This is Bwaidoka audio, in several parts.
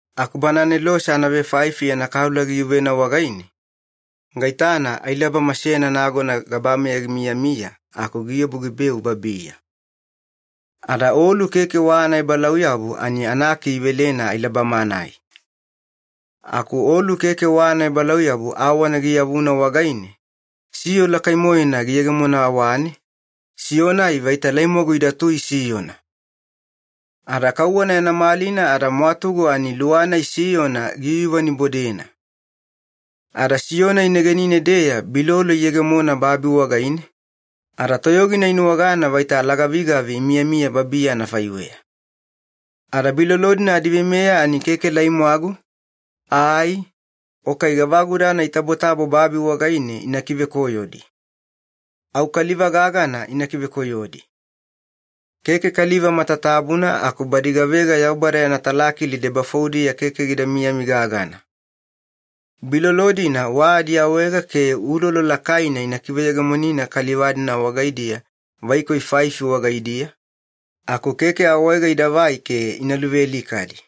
Aku bana anelose anavefaifi yana kaula giyuvena wagaine, gaitana ailabama seyana nagona gabameya gimiyamiya aku giobu gibeu babiya. Ada olu keke wa anaebalauyabu ani anaki ivelena ailabama-nai. Aku olu keke wa anaebalauyabu awana giyavuna wagaine, siyo lakai-moena giyegemona awane, siyo-nai vaita laimwagu idatui siyona. Ada kauwana yana malina ada mwatugu ani luwa-nai siyona giyuyuvanibodena. Ada siyo-nai negenine-deya bilolo iyegemona babi wagaine, ada toyogina inuwagana vaita alagavigavi imiyamiya babiya anafaiweya. Ada bilolo-dina adiveimeya ani keke laimwagu, ai, o kai gavagudana itabotabo babi wagaine ina kivekoyodi. Au kaliva gagana ina kivekoyodi. Keke kaliva matatabuna aku badi gavega Yaubada yana talakili debafoudiya keke gida miyami gagana. Bilolo-dina wa adiawaega ke ulolo lakaina ina kiveyegemonina kaliva-dina wagaidiya vaikoi faifi wagaidiya, aku keke awaega idavai ke ina luvealikadi.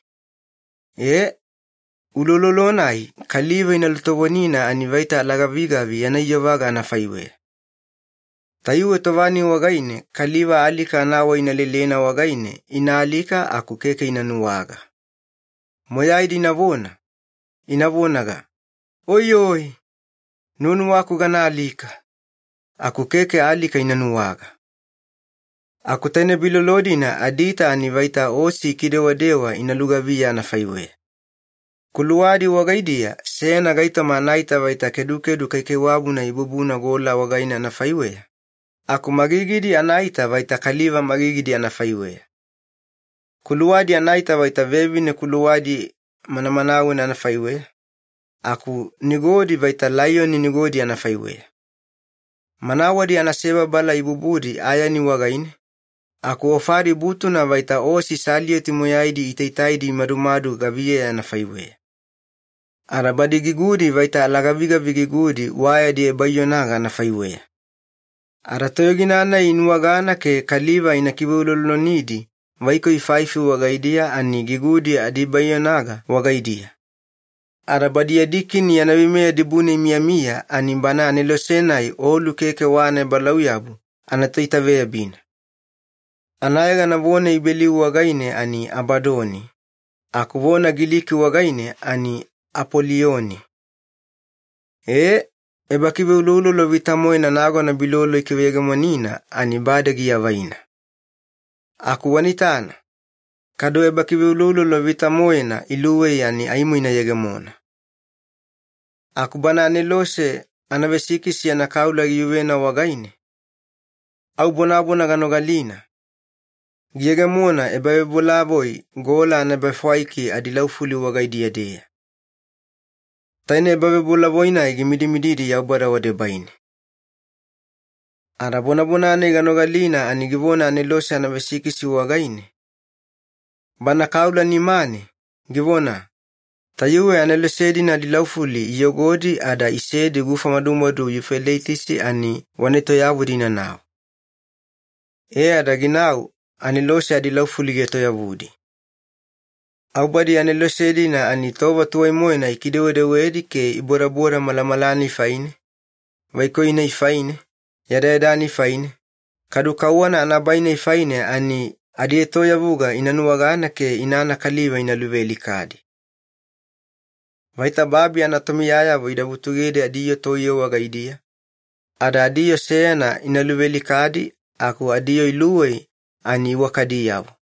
Ee, uloulolo-nai kaliva ina lutovonina ani vaita alagavigavi yana iyovaga anafaiweya. Tayuwe tova-nai wagaine, kaliva alika anawai ina lelena wagaine ina alika, aku keke ina nuwaga. Moyaidi inavona, ina vonaga, “Oiyoi! Nuwanuwaku gana alika!” aku keke alika ina nuwaga. Aku taine bilolo-dina adiita ani vaita osi ikidewadewa ina lugaviya anafaiweya. Kuluwadi wagaidiya seyana gaitoma anaita vaita kedukedu kaikaiwabuna ibubuna gola wagaine anafaiweya, aku magigidi anaita vaita kaliva magigidi anafaiweya. Kuluwadi anaita vaita vevine kuluwadi manamanawena anafaiweya, aku nigodi vaita laiyoni nigodi anafaiweya. Manawadi anasebabala ibubudi ayani wagaine, aku ofadi butuna vaita osi salioti moyaidi itaitaidi imadumadu gaviyeya anafaiweya. Ada badi gigudi vaita alagavigavi gigudi wa yadi ebaiyonaga anafaiweya. Ada toyogina-nai inuwagana ke kaliva ina kiveuloulolonidi vaikoi faifi wagaidiya ani gigudi adi ebaiyonaga wagaidiya. Ada badi yadi kini yana veimeya dibune imiyamiya, ani bana anelose-nai olu keke wa anaebalauyabu anatoitaveyabina. Anayegana vona Ibeliu wagaine ani ‘Abadoni’, aku vona Giliki wagaine ani ‘Apolioni’. Ee, ebakiveuloulolo vita-moena nagona bilolo ikiveyegemonina, ani bade giavaina. Aku wana itana, kadu ebakiveuloulolo vita-moena iluwei ani aimo ina yegemona. Aku bana anelose anavesikisi yana kaula giyuvena wagaine, au bonabona ganogalina, giyegemona ebavebolavoi gola anaebafwaiki adilaufuli wagaidiya-deya. Taine ebavebolavoi-nai gimidimididi Yaubada wadebaine. Ada bonabona-nai ganogalina ani givona anelose anavesikisi wagaine, bana kaula nimane, givona, “Tayuwe anelose-dina adilaufuli iyogodi ada isedi gufa madumadu Yufeleitisi ani, wana etoyavudi inanau.” E ada ginau anelose adilaufuli gietoyavudi. Au badi anelose-dina ani tova tuwai-moena ikidewedewedi ke ibodaboda malamala-nai faine, vaikoi-nai faine, yadayada-nai faine, kadu kauwana anabai-nai faine ani adietoyavuga ina nuwagana ke inana kaliva ina luvealikadi. Vaita babi anatomiyayavo ida vutugedi adiyoo toiye wagaidiya, ada adiyoo seyana ina luvealikadi, aku adiyoo iluwei ani iwakadiyavo.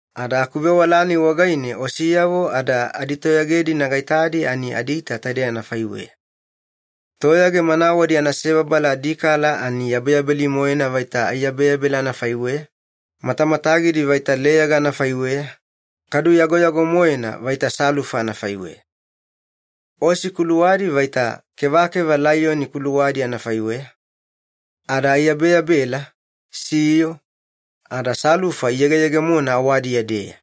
Ada akuvewala-nai wagaine osiyavo ada aditoyage-dina gaitadi ani adiita taidei anafaiweya. Toyage manawadi anasebabala adikala ani yabeyabeli-moena vaita aiyabeyabela anafaiweya, matamatagidi vaita leyaga anafaiweya, kadu yagoyago-moena vaita salufa anafaiweya. Osi kuluwadi vaita kevakeva laiyoni kuluwadi anafaiweya, ada aiyabeyabela, siyo, ada salufa iyegeyegemona awadiya-deya.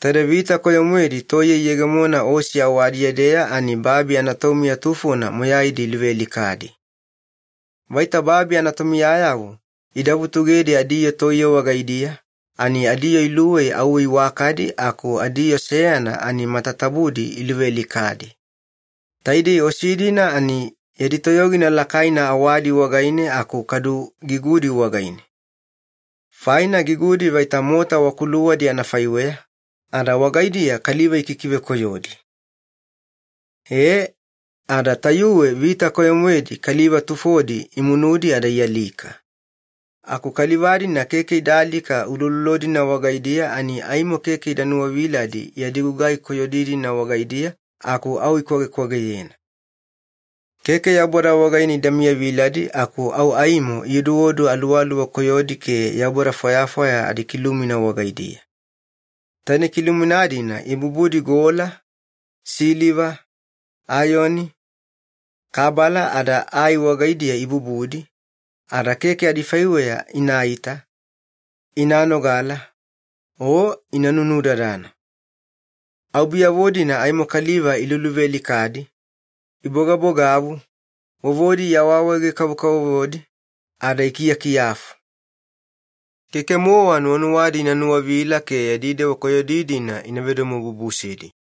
Taide vita koyo-moedi toiye iyegemona osi awadiya-deya ani babi anatomiya tufona moyaidi iluvealikadi. Vaita babi anatomiyayavo ida vutugedi adiyoo toiye wagaidiya, ani adiyoo iluwei auwe iwakadi aku adiyoo seyana ani matatabudi iluvealikadi. Taidei osi-dina ani yadi toyogina lakaina awadi wagaine aku kadu gigudi wagaine. Faina gigudi vaita mota wa kuluwadi anafaiweya, ada wagaidiya kaliva ikikivekoyodi. Ee, ada tayuwe vita koyo-moedi kaliva tufodi imunudi ada ialika. Aku kaliva-dina keke ida alika uloulolo-dina wagaidiya ani aimo keke ida nuwaviladi yadi gugai koyodi-dina wagaidiya, aku au ikwagekwageyena. Keke Yaubada wagaine ida miyaviladi aku au aimo ioduodu aluwaluwa koyodi ke yaubada fwayafwaya adikilumina wagaidiya. Taine kilumina-dina ibubudi gola, siliva, ayani, kabala, ada ai wagaidiya ibubudi, ada keke adifaiweya inaita, ina nogala, o ina nunudadana. Au biyavo-dina aimo kaliva iluluvealikadi, ibogabogavu, vovodi iawaawaege-kavokavovodi, ada ikiyakiyafu. Keke-mowa nuwanuwadi ina nuwavila ke yadi dewa koyodi-dina ina vedomobubusedi.